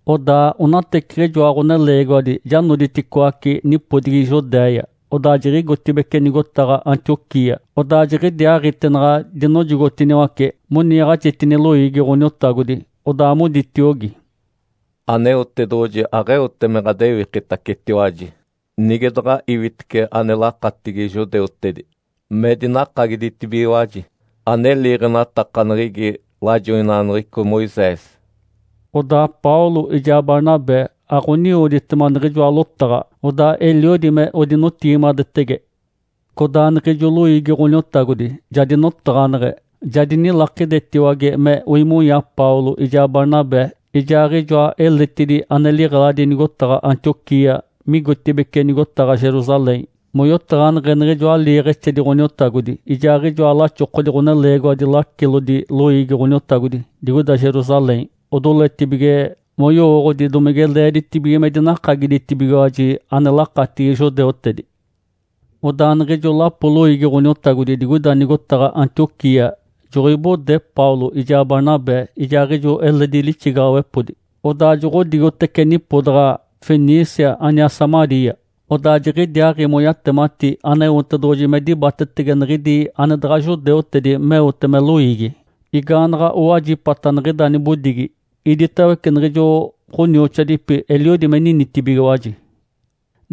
Odaa onateciɡ̶ijoa ɡ̶oneleegiwadi ja noditicoaci nipodigi Judéia, odaa jiɡ̶igotibeci nigotaɡ̶a Antioquia. Odaa jiɡ̶idiaaɡ̶ite naɡ̶a dinojogotiniwace moniiɡ̶axitini loiigi Ǥoniotagodi, odaa moditiogi, “Aneotedoɡ̶oji aɡ̶eote me ɡ̶adewikitacetiwaji nige daɡ̶a iwitece ane lakatigi judeutedi me dinakagiditibigiwaji ane liiɡ̶enatakaneɡ̶egi lajoinaɡ̶aneɡ̶eco Moisés.” Odaa Paulo ijaa Barnabé aɡ̶oniwoditema niɡ̶ijoa lotaɡ̶a, odaa eliodi me odinotigimadetege. Codaa niɡ̶ijo loiigi Ǥoniotagodi ja dinotaɡ̶aneɡ̶e, ja dinilakidetiwage me oimonya Paulo ijaa Barnabé ijaaɡ̶ijoa eletidi ane liɡ̶eladi nigotaɡ̶a Antioquia migotibeci nigotaɡ̶a Jerusalém moyotaɡ̶aneɡ̶e niɡ̶ijoa liiɡ̶exedi Ǥoniotagodi ijaaɡ̶ijoa laxokodi ɡ̶oneleegiwadi lacilodi loiigi Ǥoniotagodi digoida Jerusalém odoletibige moyowooɡ̶odi domige leeditibige me dinakagiditibigiwaji ane lakatigi judeutedi. Odaa niɡ̶ijo lapo loiigi Ǥoniotagodi digoida nigotaɡ̶a Antioquia joɡ̶oibode Paulo ijaa Barnabé ijaaɡ̶ijo eledi lixigaɡ̶awepodi, odaa joɡ̶odigotece nipodaɡ̶a Fenícia aniaa Samaria. Odaa jiɡ̶idiaaɡ̶i moyatemati Aneotedoɡ̶oji me dibatetege niɡ̶idi ane daɡ̶a judeutedi meote me loiigi. Igaanaɡ̶a owajipata niɡ̶ida nibodigi, iditawece niɡ̶ijo ɡ̶onioxoadipi eliodi me ninitibigiwaji.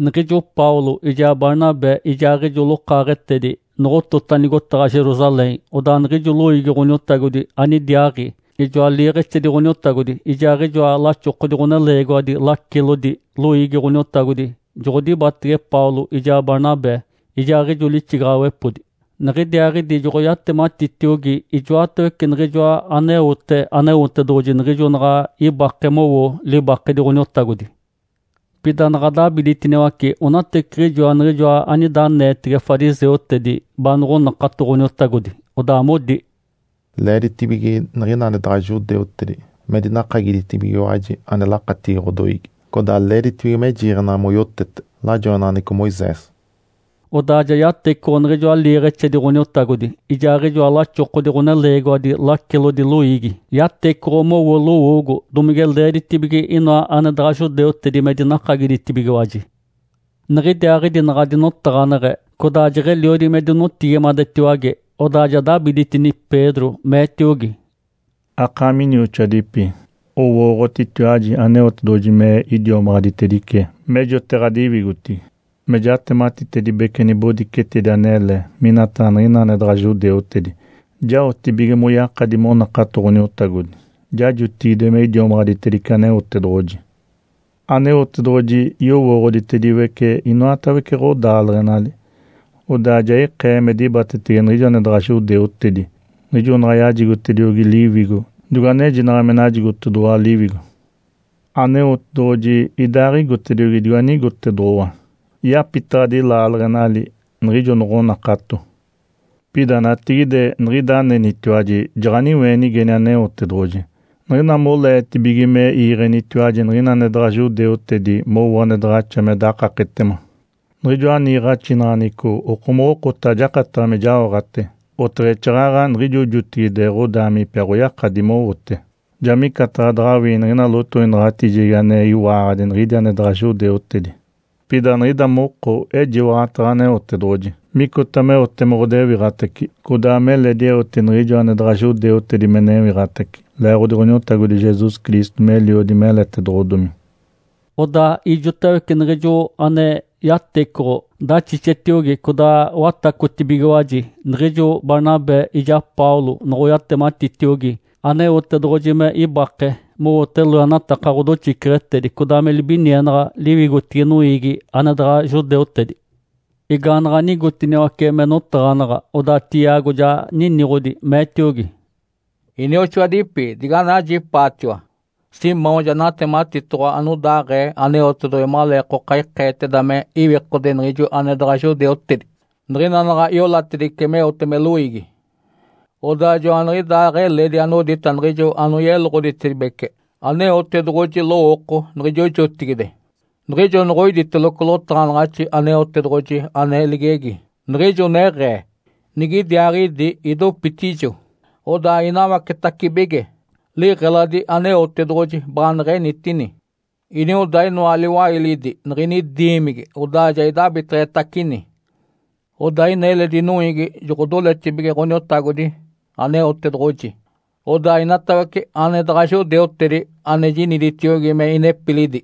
Niɡ̶ijo Paulo ijaa Barnabé ijaaɡ̶ijo lokaaɡ̶etedi noɡ̶otota nigotaɡ̶a Jerusalém, odaa niɡ̶ijo loiigi Ǥoniotagodi anidiaaɡ̶i, ijoa liiɡ̶exedi Ǥoniotagodi, ijaaɡ̶ijoa laxokodi ɡ̶oneleegiwadi lacilodi loiigi Ǥoniotagodi joɡ̶odibatege Paulo ijaa Barnabé ijaaɡ̶ijo lixigaɡ̶awepodi. Niɡ̶idiaaɡ̶idi joɡ̶oyatematitiogi ijoatawece niɡ̶ijoa aneote Aneotedoɡ̶oji niɡ̶ijo naɡ̶a ibake mowo libakedi Ǥoniotagodi. Pida naɡ̶a dabiditiniwace onateciɡ̶ijoa niɡ̶ijoa anida aneetege fariseutedi baanoɡ̶onakato Ǥoniotagodi, odaa modi, “Leeditibige niɡ̶ina ane daɡ̶a judeutedi me dinakagiditibigiwaji ane lakatigi ɡ̶odoiigi, codaa leeditibige me jiiɡ̶enaɡ̶a moyotete lajoinaɡ̶aneɡ̶eco Moisés.” Odaa ja yatecoɡ̶o niɡ̶ijoa liiɡ̶exedi Ǥoniotagodi ijaaɡ̶ijoa laxokodi ɡ̶oneleegiwadi lacilodi loiigi. Yatecoɡ̶o mowo lowoogo domige leeditibige inoa ane daɡ̶a judeutedi me dinakagiditibigiwaji. Niɡ̶idiaaɡ̶idi naɡ̶a dinotaɡ̶aneɡ̶e codaa jeɡ̶eliodi me dinotigimadetiwage, odaa ja dabiditini Pedro, meetiogi, “Akaami inioxoadipi, owooɡ̶otitiwaji Aneotedoɡ̶oji me idiomaɡ̶aditedice mejote ɡ̶adiwigotigi, me jatematitedibece nibodicetedi anele minataɡ̶a niɡ̶ina ane daɡ̶a judeutedi jaotibige moyakadi monakato Ǥoniotagodi. Ja jotigide me idiomaɡ̶aditedice Aneotedoɡ̶oji. Aneotedoɡ̶oji yowooɡ̶oditediwece inoatawece ɡ̶odaaleɡ̶enali. Odaa ja ikee me dibatetege niɡ̶ijo ane daɡ̶a judeutedi niɡ̶ijo naɡ̶aɡ̶a yajigotediogi Liwigo digo anejinaɡ̶a me najigotedoɡ̶owa Liwigo. Aneotedoɡ̶oji idaaɡ̶igotediogi digo anigotedoɡ̶owa. Yapitaɡ̶adi laaleɡ̶enali niɡ̶ijo noɡ̶onakato. Pida natigide niɡ̶ida anenitiwaji jaɡ̶aniweenigeni Aneotedoɡ̶oji niɡ̶ina moleetibige me iiɡ̶enitiwaji niɡ̶ina ane daɡ̶a judeutedi mowo ane daɡ̶axa me dakaketema, niɡ̶ijoa niiɡ̶axinaɡ̶aneɡ̶eco okomoɡ̶okota ajakataɡ̶a me jaoɡ̶ate, oteɡ̶exaaɡ̶aɡ̶a niɡ̶ijo jotigide ɡ̶odaamipi aɡ̶oyakadi mowote. Ja micataɡ̶a daɡ̶awii niɡ̶ina lotoinaɡ̶atijegi ane iwaaɡ̶adi niɡ̶idi ane daɡ̶a judeutedi. Pida niɡ̶ida moko ejiwaɡ̶ataɡ̶a Aneotedoɡ̶oji micota meote me ɡ̶odewiɡ̶atace codaa meledi eote niɡ̶ijo ane daɡ̶a judeutedi me newiɡ̶atace leeɡ̶odi Ǥoniotagodi Jesus Cristo meliodi meletedoɡ̶odomi.” Odaa ijotawece niɡ̶ijo ane yatecoɡ̶o daxixetiogi codaa watacotibigiwaji niɡ̶ijo Barnabé ijaa Paulo noɡ̶oyatematitiogi Aneotedoɡ̶oji me ibake mowote loenataka ɡ̶odoxiceɡ̶etedi codaa me libinienaɡ̶a liwigotigi noiigi ane daɡ̶a judeutedi. Igaanaɡ̶a nigotiniwace me notaɡ̶anaɡ̶a, odaa Tiago ja niniɡ̶odi, meetiogi, “Inioxoadipi, diganajipaatiwa! Simão ja natematitoɡ̶owa anodaaɡ̶ee Aneotedoɡ̶oji maleekoka ikeeteda me iwikode niɡ̶ijo ane daɡ̶a judeutedi niɡ̶ina naɡ̶a iolatedice meote me loiigi. Odaa joaniɡ̶idaaɡ̶eledi anodita niɡ̶ijo anoyeloɡ̶oditedibece Aneotedoɡ̶oji lowooko niɡ̶ijo jotigide, niɡ̶ijo noɡ̶oiditeloco lotaɡ̶anaɡ̶axi Aneotedoɡ̶oji ane ligegi, niɡ̶ijo neɡ̶ee, ‘Nigidiaaɡ̶idi idopitijo, odaa inawacetacibige liɡ̶eladi Aneotedoɡ̶oji baaneɡ̶enitini. Inioda inoa liwailidi niɡ̶ini diimigi, odaa ja idabiteɡ̶etacini. Odaa ina eledi noiigi joɡ̶odoletibige Ǥoniotagodi Aneotedoɡ̶oji, odaa inatawece ane daɡ̶a judeutedi ane jiniditiogi me inepilidi,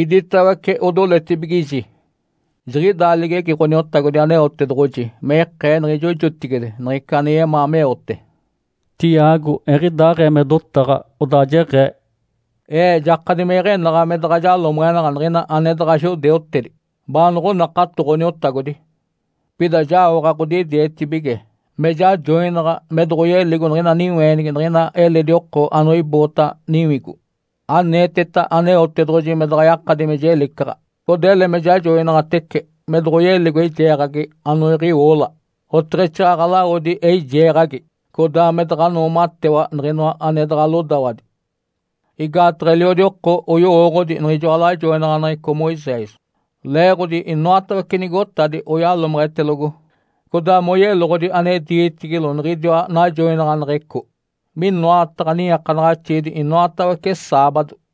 iditawece odoletibigiji.’ Jiɡ̶idaa ligegi Ǥoniotagodi Aneotedoɡ̶oji me ikee niɡ̶ijo jotigide niɡ̶ica ane yemaa meote.” Tiago eɡ̶idaaɡ̶ee me dotaɡ̶a, odaa jeɡ̶ee, “Ee jakadi me iɡ̶enaɡ̶a me daɡ̶a jalomeɡ̶enaɡ̶a niɡ̶ina ane daɡ̶a judeutedi baanoɡ̶onakato Ǥoniotagodi. Pida jaoɡ̶a ɡ̶odidietibige me jajoinaɡ̶a me doɡ̶oyeligo niɡ̶ina niweenigi niɡ̶ina eledi oko anoiboota niwigo, aneeteta Aneotedoɡ̶oji me daɡ̶a yakadi me jelicaɡ̶a. Codaa ele me jajoinaɡ̶atece me doɡ̶oyeligo eijeeɡ̶agi anoiɡ̶iwoola oteɡ̶exaaɡ̶aɡ̶a lawodi eijeeɡ̶agi, codaa me daɡ̶a noomatewa niɡ̶inoa ane daɡ̶a lodawadi. Igaataɡ̶a eliodi oko oyowooɡ̶odi niɡ̶ijoa lajoinaɡ̶aneɡ̶eco Moisés, leeɡ̶odi inoatawece nigotadi oyalomeɡ̶etelogo codaa moyeloɡ̶odi ane diitigilo niɡ̶idiwa najoinaɡ̶aneɡ̶eco minoataɡ̶a niiakanaɡ̶axiidi inoatawece saabado.”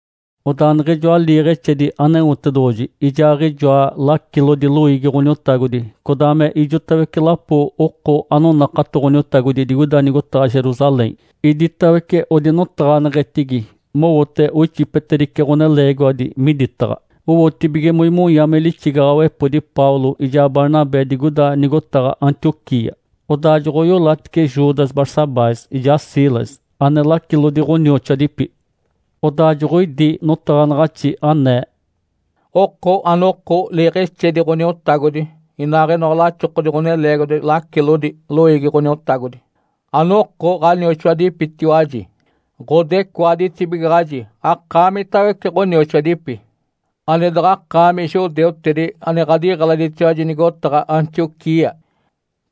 Odaa niɡ̶ijoa liiɡ̶exedi Aneotedoɡ̶oji ijaaɡ̶ijoa lacilodi loiigi Ǥoniotagodi codaa me ijotawece lapo oko anonakato Ǥoniotagodi digoida nigotaɡ̶a Jerusalém, iditawece odinotaɡ̶aneɡ̶etigi mowote oixipetedice ɡ̶oneleegiwadi miditaɡ̶a, owotibige moimonya me lixigaɡ̶awepodi Paulo ijaa Barnabé digoida nigotaɡ̶a Antioquia. Odaa joɡ̶oiolatice Judas Barsabás ijaa Silas, ane lacilodi ɡ̶onioxoadipi. Odaa joɡ̶oidi notaɡ̶anaɡ̶axi anee, “Oko anoko liiɡ̶exedi Ǥoniotagodi inaaɡ̶inoa laxokodi ɡ̶oneleegiwadi lacilodi loiigi Ǥoniotagodi, anoko ɡ̶anioxoadipitiwaji, ɡ̶odecoaditibigaɡ̶aji akaamitawece ɡ̶onioxoadipi ane daɡ̶akaami judeutedi ane ɡ̶adiɡ̶eladitiwaji nigotaɡ̶a Antioquia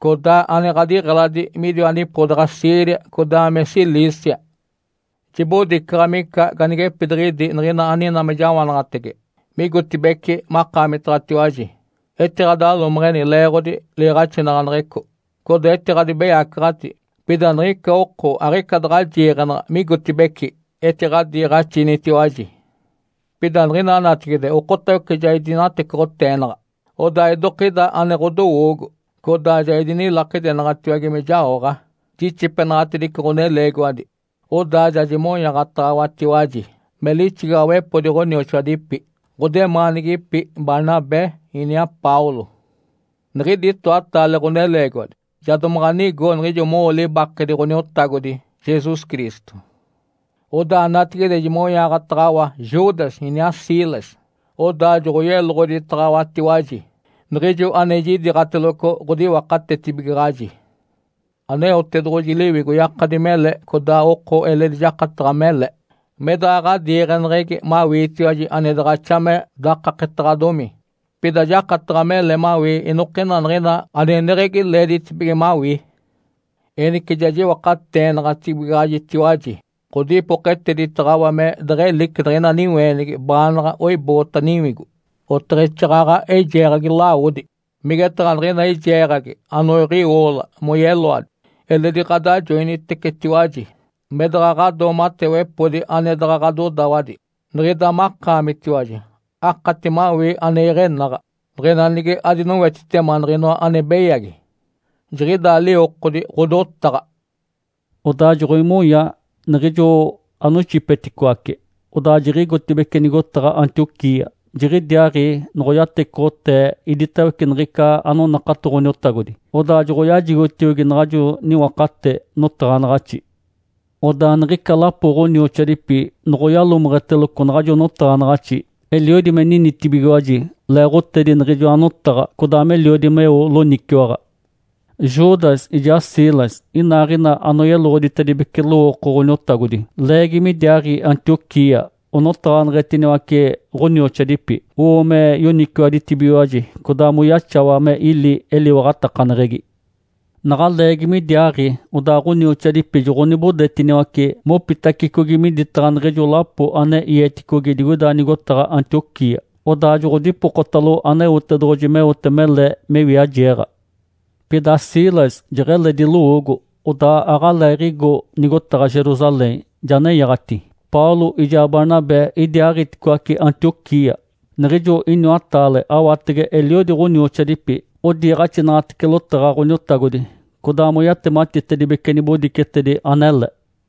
codaa ane ɡ̶adiɡ̶eladi midiwa nipodaɡ̶a Síria codaa me Cilícia. Jibodicaɡ̶a mica ganigepidiɡ̶idi niɡ̶ina aninaa me jawanaɡ̶atege migotibeci makaamitaɡ̶atiwaji, etiɡ̶adalomeɡ̶eni leeɡ̶odi liiɡ̶axinaɡ̶aneɡ̶eco, codaa etiɡ̶adibeyacaɡ̶ati. Pida niɡ̶ica oko aɡ̶ica daɡ̶a jiiɡ̶enaɡ̶a migotibeci etiɡ̶adiiɡ̶axinitiwaji. Pida niɡ̶ina natigide okotawece ja idinatecoɡ̶oteenaɡ̶a, odaa idokida ane ɡ̶odowoogo. Codaa ja idinilakidenaɡ̶atiwage me jaoɡ̶a jixipenaɡ̶atedice ɡ̶oneleegiwadi, odaa ja jimonyaaɡ̶ataɡ̶awatiwaji me lixigaɡ̶awepodi ɡ̶onioxoadipi ɡ̶odemaanigipi Barnabé iniaa Paulo. Niɡ̶idi itoataale ɡ̶oneleegiwadi ja domaɡ̶a nigo niɡ̶ijo mowo libakedi Ǥoniotagodi Jesus Cristo. Odaa natigide jimonyaaɡ̶ataɡ̶awa Judas iniaa Silas, odaa joɡ̶oyeloɡ̶oditaɡ̶awatiwaji niɡ̶ijo ane jidiiɡ̶ateloco ɡ̶odiwakatetibigaɡ̶aji. Aneotedoɡ̶oji Liwigo yakadi mele codaa oko eledi jakataɡ̶a mele me daɡ̶a ɡ̶adiiɡ̶eneɡ̶egi mawiitiwaji ane daɡ̶axa me dakaketaɡ̶adomi, pida jakataɡ̶a mele mawii inokina niɡ̶ina aneneɡ̶egi leeditibige mawii. Enice ja jiwakateenaɡ̶atibigaɡ̶ajitiwaji ɡ̶odipoketeditaɡ̶awa me deɡ̶elici niɡ̶ina niweenigi baanaɡ̶a oiboota niwigo oteɡ̶exaaɡ̶aɡ̶a eijeeɡ̶agi lawodi, migetaɡ̶a niɡ̶ina eijeeɡ̶agi anoiɡ̶iwoola moyeloadi. Eledi ɡ̶adajoinitecetiwaji me daɡ̶a ɡ̶adoomatewepodi ane daɡ̶a ɡ̶adodawadi. Niɡ̶ida makaamitiwaji akati mawii ane iɡ̶enaɡ̶a niɡ̶ina nige adinowetitema niɡ̶inoa ane beyagi. Jiɡ̶idaa liwokodi ɡ̶odotaɡ̶a.” Odaa joɡ̶oimonya niɡ̶ijo anoixipeticoace, odaa jiɡ̶igotibeci nigotaɡ̶a Antioquia. Jiɡ̶idiaaɡ̶i noɡ̶oyatecoɡ̶otee iditawece niɡ̶ica anonakato Ǥoniotagodi, odaa joɡ̶oyajigotiogi naɡ̶ajo niwakate notaɡ̶anaɡ̶axi. Odaa niɡ̶ica lapo ɡ̶onioxoadipi noɡ̶oyalomeɡ̶eteloco naɡ̶ajo notaɡ̶anaɡ̶axi, eliodi me ninitibigiwaji leeɡ̶otedi niɡ̶ijoa notaɡ̶a, codaa meliodi meo loniciwaɡ̶a. Judas ijaa Silas inaaɡ̶ina anoyeloɡ̶oditedibece lowooko Ǥoniotagodi leegi midiaaɡ̶i Antioquia onotaɡ̶aneɡ̶etiniwace ɡ̶onioxoadipi, owo me yoniciwaditibigiwaji, codaa moyaxawa me ili eliwaɡ̶atakaneɡ̶egi. Naɡ̶a leegi midiaaɡ̶i, odaa ɡ̶onioxoadipi joɡ̶onibodetiniwace mopitacicogi miditaɡ̶a niɡ̶ijo lapo ane ieticogi digoida nigotaɡ̶a Antioquia. Odaa joɡ̶odipokotalo Aneotedoɡ̶oji meote mele me wiajeeɡ̶a. Pida Silas jeɡ̶eledi lowoogo, odaa aɡ̶aleeɡ̶igo nigotaɡ̶a Jerusalém, ja nenyaɡ̶ati. Paulo ijaa Barnabé idiaaɡ̶iticoaci Antioquia. Niɡ̶ijo iniwataale awatege eliodi ɡ̶onioxoadipi odiiɡ̶axinaɡ̶atece lotaɡ̶a Ǥoniotagodi codaa moyatematitedibece nibodicetedi anele.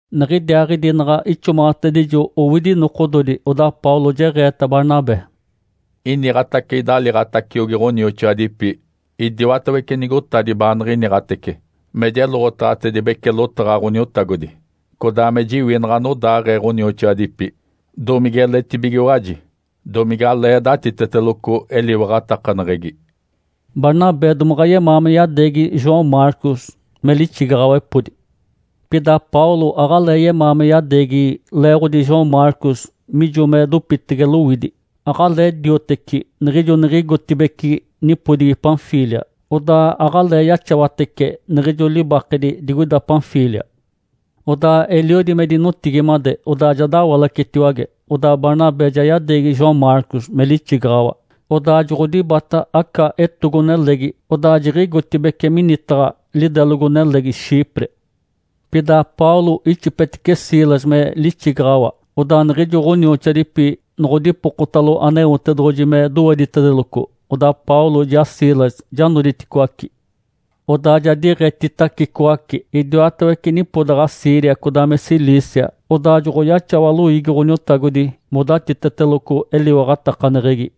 Niɡ̶idiaaɡ̶idi naɡ̶a ixomaɡ̶atedijo owidi nokododi, odaa Paulo jeɡ̶eeta Barnabé, “Iniɡ̶atace idaliiɡ̶ataciogi ɡ̶onioxoadipi idiwatawece nigotadi baaniɡ̶iniɡ̶atece me jeloɡ̶otaɡ̶atedibece lotaɡ̶a Ǥoniotagodi, codaa me jiwinaɡ̶a anodaaɡ̶ee ɡ̶onioxoadipi, domigeletibigiwaji, domigalee datiteteloco eliwaɡ̶atakaneɡ̶egi.” Barnabé domaɡ̶a yemaa me yadeegi João Marcos me lixigaɡ̶awepodi. Pida Paulo aɡ̶alee yemaa me yadeegi leeɡ̶odi João Marcos mijo me dopitege lowidi, aɡ̶alee dioteci niɡ̶ijo niɡ̶igotibeci nipodigi Panfília, odaa aɡ̶alee yaxawatece niɡ̶ijo libakedi digoida Panfília. Odaa eliodi me dinotigimade, odaa ja dawalacetiwage. Odaa Barnabé ja yadeegi João Marcos me lixigaɡ̶awa, odaa joɡ̶odibata aca etogo-nelegi, odaa jiɡ̶igotibeci minitaɡ̶a lidelogo-nelegi Chipre. Pida Paulo ixipetice Silas me lixigaɡ̶awa. Odaa niɡ̶ijo ɡ̶onioxoadipi noɡ̶odipokotalo Aneotedoɡ̶oji me doweditedeloco, odaa Paulo ijaa Silas ja noditicoaci. Odaa ja diiɡ̶etitacicoace idiwatawece nipodaɡ̶a Síria codaa me Cilícia, odaa joɡ̶oyaxawa loiigi Ǥoniotagodi modatiteteloco eliwaɡ̶atakaneɡ̶egi.